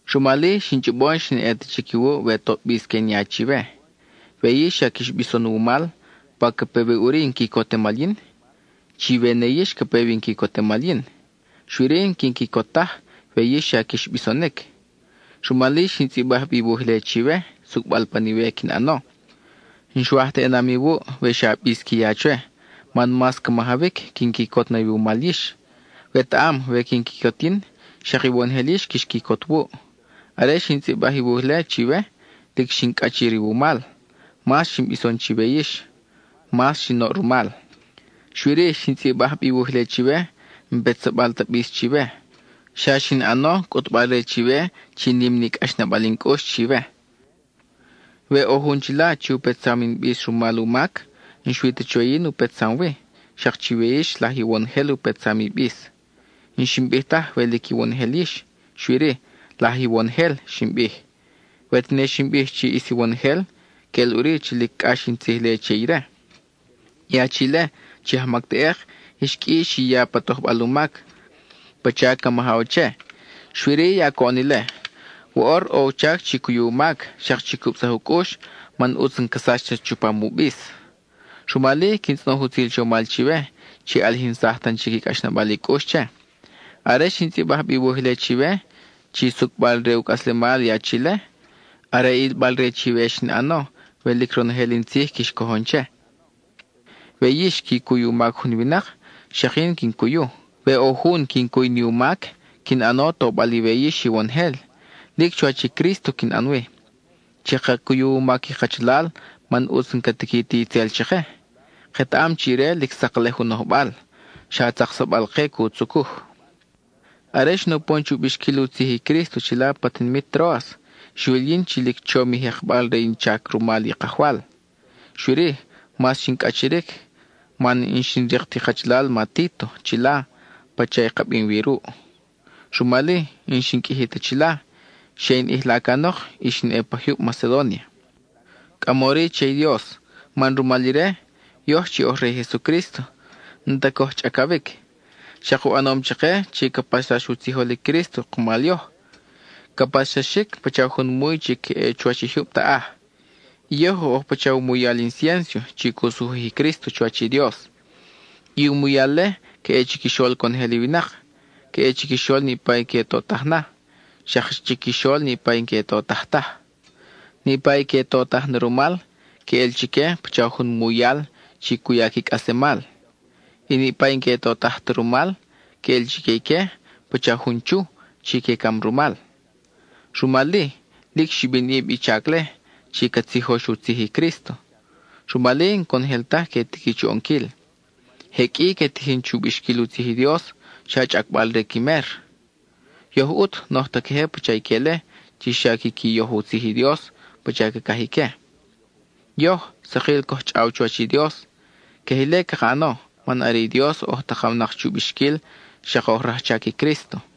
Rumal-i, xin chʼobo n-xin ʼe ta chic iwuʼ we toʼ bis que in ya chiwe. We yix xa quix bison wumal, ¿pa ca pe wi ʼuri in quicotemal yin? Chiwe ne yix ca pe wi in quicotemal yin; xui-ri, n-quin quicot taj we yix xa quix bisonic. Rumal-i, xin tzʼibaj bi i wuj-le chiwe, sucʼbal pan iwe quin ʼano. N-xwaj ta ʼenam iwuʼ we xa bis qui ya chwe, man mas ca majawic quin quicot na iwumal yix. Wetaʼam, we quin quicot yin, xak iwonojel yix quix quicot wuʼ. Are xin tzʼibaj i wuj-le chiwe, lic xin cʼachir iwumal; mas xin bison chiwe yix, mas xin oʼ rumal. Xui-ri, xin tzʼibaj bi i wuj-le chiwe, n-petsabal ta bis chiwe, xa xin ʼano cʼutbal-re chiwe chi nim ni cʼaxnabal in cʼux chiwe. We ʼo jun chila chi u petsam in bis rumal u mac, n-xui ta chwe yin u petsam wi, xak chiwe yix laj iwonojel u petsam i bis. N-xin bij taj we lic iwonojel yix, xui-ri “laj iwonojel” xin bij; we tene xin bij chi ʼis iwonojel, queʼel ʼuri chi lic cʼax in tzij-le che ire. I achi-le, chi ajmac teʼek, ix qʼui chi xi ya pa tojbal u mac, pacha ca majaw che; xui-ri, ya coʼon ile. Woʼor, ʼo u chac chi cuyu u mac, xak chi cubsaj u cʼux, man ʼutz n-ca sach ta chupam u bis. Rumal-i, quin tzʼonoj i utzil chomal chiwe, chi ʼalijinsaj tan chic i cʼaxnabal i cʼux che. Are xin tzʼibaj bi i wuj-le chiwe, chi sucʼbal re u cʼaslemal i achi-le, are ilbal-re chiwe xin ʼano, we lic ronojel in tzij quix cojon che. We yix qui cuy u mac jun winak, xak yin quin cuyu. We ʼo jun quin cuy ni u mac, quin ʼano tobal iwe yix iwonojel; lic chuwach i Crísto quin ʼan wi. Chaka cuyu u mac i kachalal man ʼutz n-ca tiqui ti itzel chake; ketaʼam chi ire lic saklej u nojbal, xa tzaksabal-ke cu tzucuj. Are xin upon chu bixquil u tzij i Crísto chila pa tinimit Tróas, xwil yin chi lic chom i jekbal re in chac rumal i Kajwal. Xui-ri, mas xin cʼachiric man n-xin rik ti kachalal ma Títo chila pacha i ka bim wi ruʼ. Rumal-i, n-xin qʼuiji ta chila, xe in ʼijla canok, y xin ʼe pa jyub Macedónia. Cʼamori che i Dios man rumal ire, yoj chi oj re i Jesucrísto n-ta coj chʼacawic. Xak u ʼanom chake chi ca paxsax u tzijol i Crísto kumal yoj; ca paxsaxic pacha jun muy chi ca ʼe chuwach i jyub taʼaj. I yoj oj pacha u muyal inciénso chi cu sujuj i Crísto chuwach i Dios. I u muyal-le ca ʼe chiquixol conojel i winak: ca ʼe chiquixol niʼpa i que totaj na, xak chiquixol niʼpa i n-que totaj taj. Niʼpa i que totaj na rumal, queʼel chique pacha jun muyal chi cu ya qui cʼaslemal. I niʼpa i n-que totaj ta rumal, queʼel chique ique pacha jun chu chi que cam rumal. Rumal-i, lic xibinʼib i chac-le chi ca tzijox u tzij i Crísto; rumal-i n-conojel taj que tiqui chu ʼonquil. Je qʼui que tijin chu bixquil u tzij i Dios, xa chʼacbal re qui mer; yoj ʼut n-oj ta queje pacha ique-le chi xa quiqui yoj u tzij i Dios pacha cacaj ique. Yoj, sakil coj chʼaw chuwach i Dios; queje ile caka ʼano, man are i Dios oj takawnak chu bixquil, xak oj rajchac i Crísto.